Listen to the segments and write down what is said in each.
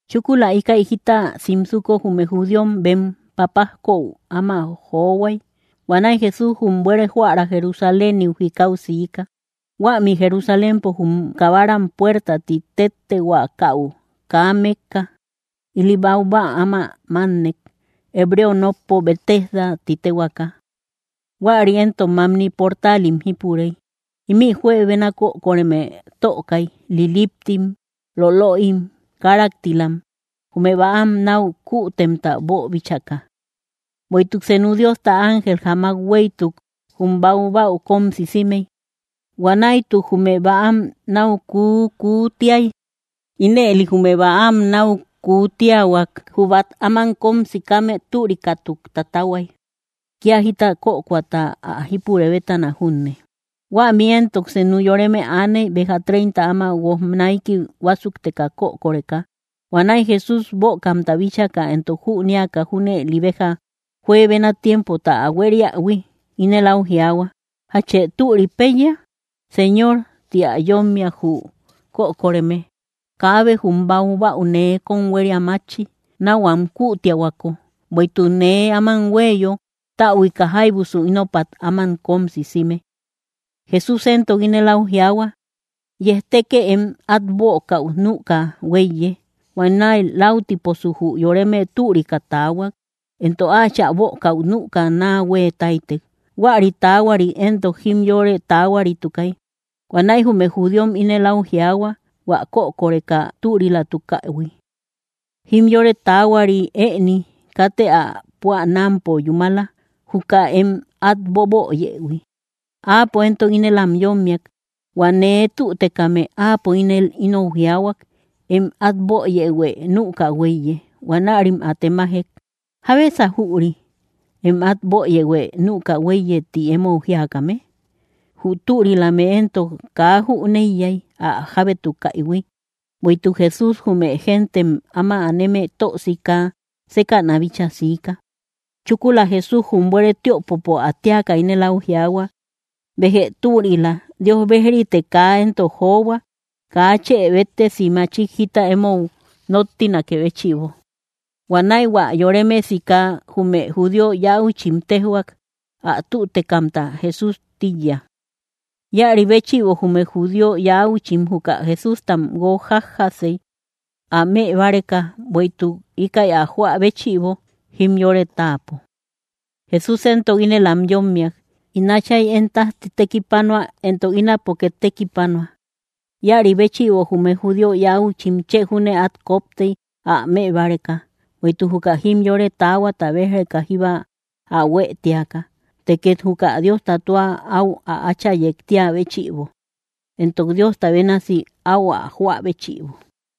Chúkula íkäi jita simsuko jume judíom bem papajkou áma johuay. Huanäi Jesús jum buere joära Jerusaléniu jikau siika. Huämi Jerusalémpo, jum kabaram puerta ti téttehuakäu kaa mekka, ili baubäa áma mánnek, hebreo nokpo Betesda ti téhuaaka. Huäri éntok mamni portaalim jípurey. Ímï juebena kökoreme tökay, liliptim, lolöim, káraktilam, jume bäam náu kuutemta boobíchaka. Bueïtuk senu Diosta ángel jamak huéytuk jum baubäau kóm sisimey; huanäituk jume bäam náu kuukuutiay. Ínëli jume bäam náu kuutiahuak, jü bát áman kóm sikame türikatuk tatahuay, kía jita kökoata ä jípurë bétana junne. Huämi éntok senu yoreme aaney, béja treinta áma guoj naiki huásukteka kökoreka. Huanäi Jesús bökamta bíchaka, éntok jünéaka junëli béja juebena tiempota ä huériähui, ínel áu jiaahua: —¿Jachë türi péiya? —Señor —ti ä yómmiak jü kökoreme—, kaabe jum bäau nee kóm huéria mátchi, náu am kuutiahuako. Bueïtuk nee áman huéyo, täbuika jáibusu ínopat áman kóm sisime. Jesús éntok ínel áu jiaahua: —Yejtekë, em át bökäu nüka huéiye. Huanäi laütiposu jü yoreme türika taahuak, éntok áachä bökäu nüka naa huée táytek. Huäri taahuarit éntok jimyore taahuaritukay. Huanäi jume judíom ínel áu jiaahua hua kökoreka türilatukähui: —Jimyore taahuari ëni; katë ä püanampo yúmala, juka em át boböyëhui. Áapo éntok ínel am yómmiak: —Huä nee tütekame, áapo ínel inou jiaahuak: “Em át böyëhuë nüka huéiye.” Huanärim ä temajek: —¿Jábesa jüri: “Em át böyëhuë nüka huéiye”, ti emou jíakame? Jü türialame éntok kaa jüneiyay ä jábétukaïhui, bueïtuk Jesús jume géntem áma aneme tö sika sékäna bíchaa siika. Chúkula Jesús jum buere tiöpopo ä téaka, ínel áu jiaahua: —Béjë türila; Dios bejritë kaa éntok johua, kaa chë béttesi machik jita emou nóttinakë béchïbo. Huanäi hua yoreme sika jume judío yauchim téjhuak, ä tütekamta Jesús tíiya. Íäri béchïbo jume judío yäuchim juka Jesústam guójjajasey ä mëbáreka, bueïtuk íkäi ä joä béchïbo, jimyore táapo. Jesús éntok ínel am yómmiak: —In Átchay én tájti tekipanua, éntok ínapo két tekipanua. Íäri béchïbo jume judío yäuchim chë júne át koptey ä mëbáreka, bueïtuk juka jimyore taahuata béj‑reka jíba ä huë tíaka, të két juka Diosta tua áu ä Áchayek tíä béchïbo, éntok Diosta bénasi áu ä joä béchïbo.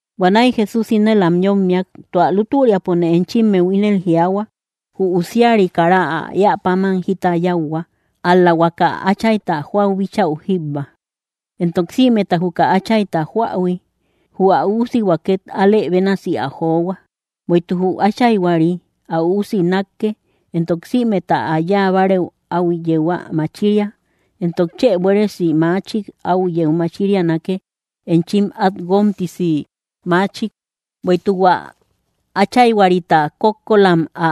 Huanäi Jesús ínel am yómmiak: —Tua lútüriapone enchimmeu ínel jiaahua: Jü Usiari kara ä éä páman jita yáuhua, ál‑la huaka Áchayta joäu bíchau jíbba. Éntok sïmeta juka Áchayta joähui, jü ä Üusihua két alë bénasi ä johua. Bueïtuk jü Áchayhuari ä Üusi nákke, éntok sïmeta ä yáa bárëu áu yeu ä machiria. Éntok chë buéresi machik áu yeu machirianake, enchim át guómtisi maachik. Bueïtuk hua Áchayhuarita kókkolam ä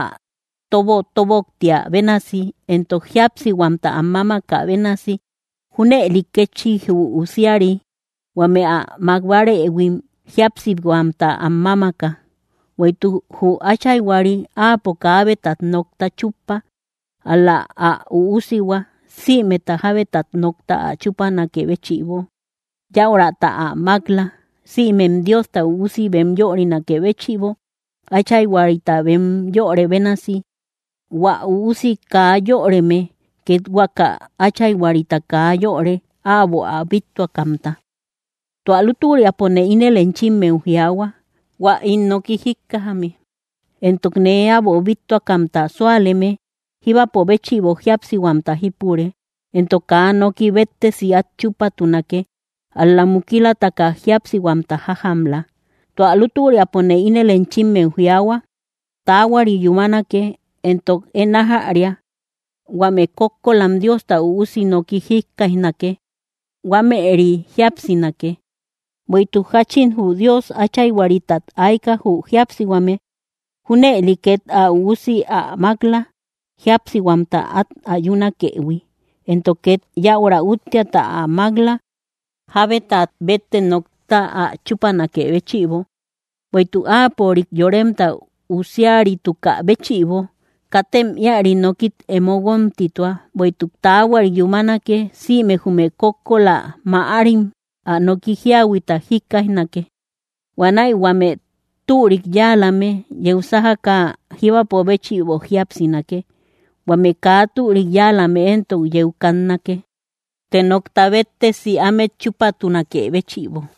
tobotoboktiä bénasi, éntok jíapsihuamta am mámakä bénasi, junëli kétchi jü usiari huame ä mák bárëhuim jíapsihuamta am mámaka. Bueïtuk jü Áchayhuari áapo kaabetat nokta chúppa, ál‑la ä Üusihua sïmeta jábetat nokta ä chúpanakë béchïbo, yäurata ä mák‑la, sïmem Diosta Üusi bem yörinakë béchïbo, Áchayhuarita bem yörë bénasi. Huä Üusi kaa yöreme két huaka Áchayhuarita kaa yöre, äbo ä bíttuakamta. ’Tua lútüriapone ínel enchimmeu jiaahua: Huä ín noki jíkkajame, éntok nee äbo bíttuakamta súaleme, jíbapo béchïbo jíapsihuamta jípure, éntok kaa noki béttesi át chúpatunake, ál‑la mukilataka jíapsihuamta jájamla. Tua lútüriapone ínel enchimmeu jiaahua: Taahuari yúmanake, éntok én ájäria: huame kókkolam Diosta Üusi noki jíkkaijnake, huámëri jíapsinake. Bueïtuk jáchín jü Dios Áchayhuaritat ayka jü jíapsihuame, junëli két ä Üusi ä mák‑la, jíapsihuamta át ayunakëhui, éntok két yäura úttiata ä mák‑la, jábetat bette nokta ä chúpanakë béchïbo, bueïtuk áapörik Yoremta Üusiaritukä béchïbo. Katem íari nokit emo guómtitua; bueïtuk taahuari yúmanake: sïme jume kókkola mäarim ä noki jíahuita jíkkaijnake. Huanäi huame türik yáalame yeu sájaka jíbapo béchïbo jíapsinake; huame kaa türik yáalame éntok yeu kannake, të nokta béttesi ámet chúpatunakë béchïbo.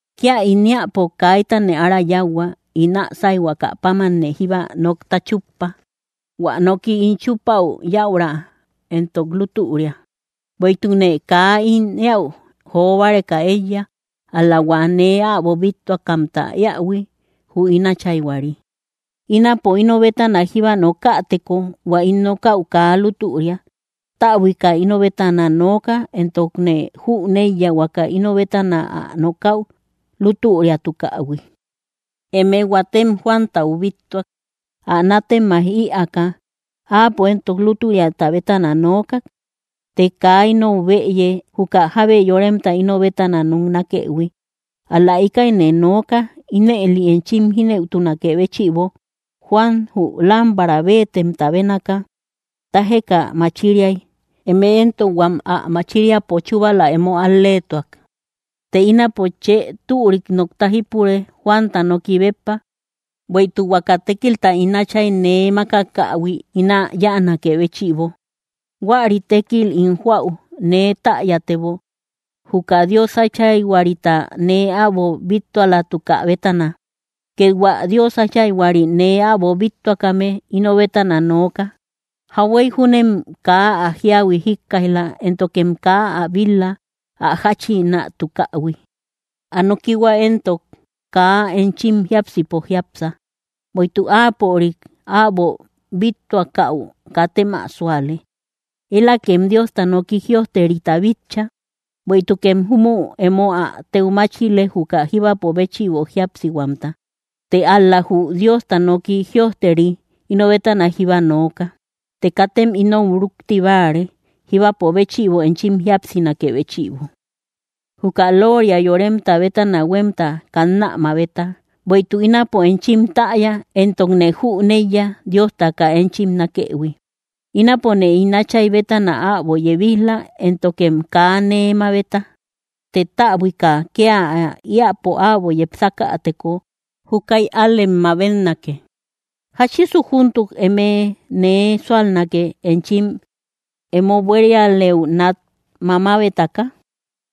’Kía ín éäpo kaitane ára yáuhua; ín ä sáyhuaka pámanne jíba nokta chuppa. Huä noki ín chupaü yäura éntok lútüria, bueïtukne kaa ín éäu jo báreka éiya, ál‑la hua nee äbo bíttuakamta éähui, jü ín Áchayhuari. Ínapo ino bétana jíba nokäteko, hua ín nokäu kaa lútüria. Täbuika ino bétana nooka, éntokne jüneiya huaka ino bétana ä nokäu lútüriatukähui. Eme huatem Juantau bíttuak, ä nátemaij ïaaka; áapo éntok lútüriata bétana nookak. Të kaa inou bëye, juka jábe yoremta ino bétana noknakëhui. Ál‑la íkäine nooka, ínëli enchim jínëutunakë béchïbo. Juan jü lámpara béetemta bénaka, tájeka machiriay. Eme éntok huam ä machiriapo chúbala emo al‑leetuak. Të ínapo chë türik nokta jípure, Juanta noki béppa. Bueïtuk huaka tékilta ín Áchay nee mákakähui ín ä yáanakë béchïbo, huäri tékil ín joäu, nee täyatebo, juka Dios Áchayhuarita nee äbo bíttualatuka bétana. Két hua Dios Áchayhuari nee äbo bíttuakame ino bétana nooka. Jauhuey júnem kaa ä jíahui jíkkaij‑la, éntokem kaa ä bil-la, ä jáchïnatukähui. Ä nokihua éntok kaa enchim jiápsipo jiápsa; bueïtuk áapörik äbo bíttuakäu, katem ä súale. Elakem Diosta nooki jïojterita bitcha; bueïtukem júmü emo ä téu máchile, juka jíbapo béchïbo jíapsihuamta. Të ál‑la jü Diosta noki jïojteri ino bétana jíba nooka. Të katem inou rúkti báare, jíbapo béchïbo enchim jíapsinakë béchïbo. ’Juka looria yoremta bétana huemta kannä mabeta. Bueïtuk, ínapo enchim täya entokne jüneiya Diosta kaa enchim nákëhui. Ínapone ín Átchay bétana äbo yebij‑la, éntokem kaa nee mabeta. Të täbuika kia ä eäpo äbo yepsakäteko, júkäi ál‑lem mabetnake. ¿Jáchisu júntuk eme nee súalnake, enchim emo buérialëu nat mamabetaka?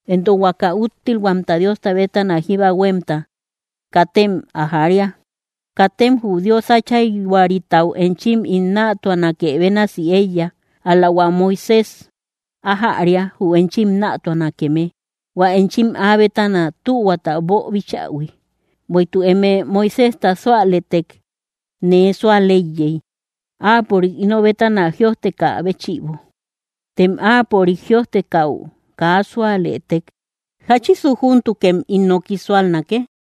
Éntok huaka úttilhuamta Diosta bétana jíba huémta, ¡katem ä jaria! Katem jü Dios Áchayhuaritau enchim ín nätuanake bénasi éiya. Ál‑la hua Moisés ájäria, jü enchim nätuanakeme, hua enchim áa bétana tühuata boobichähui. Bueïtuk eme Moiséjta súalëtek, nee súal éiyey, áapörik ino bétana jïojtekä béchïbo. Tem áapörik jïojtekäu kaa súalëtek, ¿jáchisu júntukem ín noki súalnake?